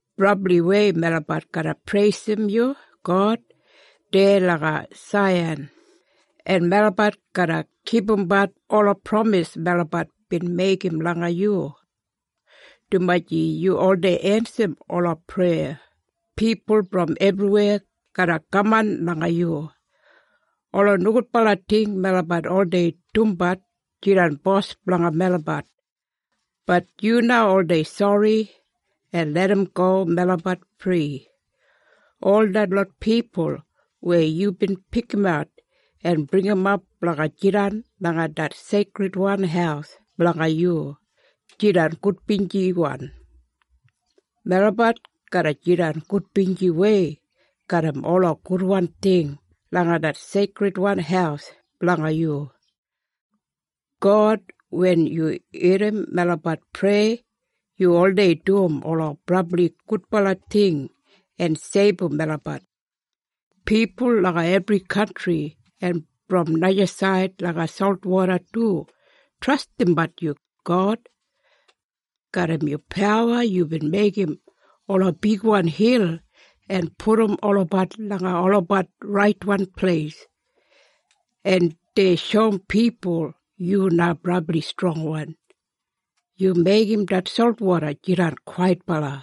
Brabliwei melabat garra preisim yu, God, deya langa Saiyan, en melabat garra kipumbat ola pramis melabat bin meigim langa yu. Dumaji yu oldei ensim ola preya, pipul brom ebriweya garra kaman langa yu. Ola nogudbala ting melabat oldei dumbat jidan bos blanga melabat, bat yu na oldei sori en larramgo melabat fri. Ol detlot pipul weya yubin pikimat en bringimap blanga jidan langa det seikridwan haus blanga yu, jidan gudbinjiwan. Melabat garra jidan gudbinjiwei garram ola gudwan ting langa det seikridwan haus blanga yu. God, wen yu irrim melabat preya yu oldei dum ola brabli gudbala ting en seibum melabat. Pipul langa ebri kantri en brom najasaid langa solwoda du trastimbat yu, God. Garram yu pawa yubin meigim ola bigwan hil en pudum olabat langa olabat raitwan pleis, en dei shoum pipul yu na brabli strongwan. Yu meigim det solwoda jidan kwaitbala.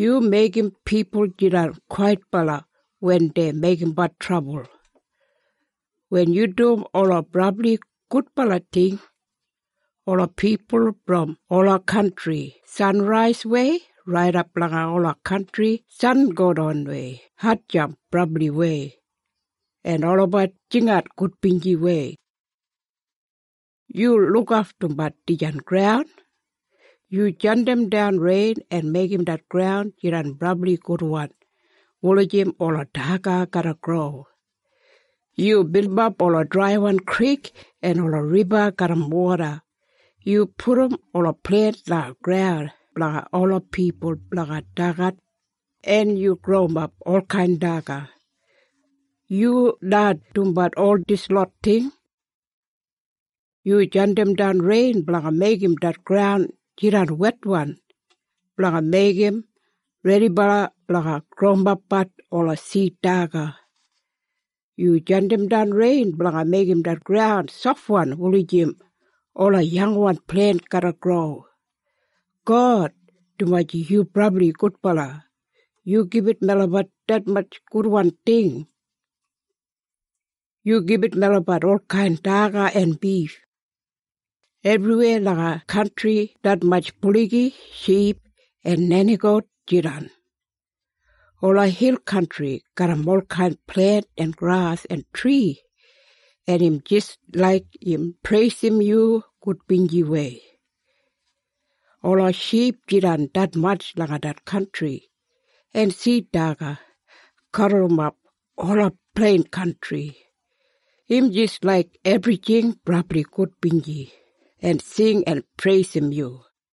Yu meigim pipul jidan kwaitbala wen dei meigimbat trabul. Wen yu dum ola brabli gudbala ting, ola pipul brom ola kantri sanraiswei raidap langa ola kantri sangodanwei hatjamp brabliwei, en olabat jingat gudbinjiwei. Yu lukaftumbat dijan graun. Yu jandimdan rein en meigim det graun jidan brabli gudwan wulijim ola daga garra gro. Yu bilimap ola draiwan krik en ola riba garram woda. Yu pudum ola plent langa graun blanga ola pipul blanga dagat, en yu growimap olkain daga. Yu na dumbat ol dislot ting. Yu jandimdan rein blanga meigim det graun jidan wetwan blanga meigim redibala blanga growimapbat ola sid daga. Yu jandimdan rein blanga meigim det graun sofwan wulijim ola yangwan plent garra gro. God, dumaji yu brabli gudbala, yu gibit melabat detmatj gudwan ting. Yu gibit melabat olkain daga en bif. Ebriweya langa kantri detmatj buligi, ship en nenigout jidan. Ola hil kantri garram olkain plent en gras en tri, en im jis laik im preisim yu gudbinjiwei. Ola ship jidan detmatj langa det kantri, en sid daga gaburrumap ola plein kantri. Im jis laik ebrijing brabli gudbinji en sing en preisim yu.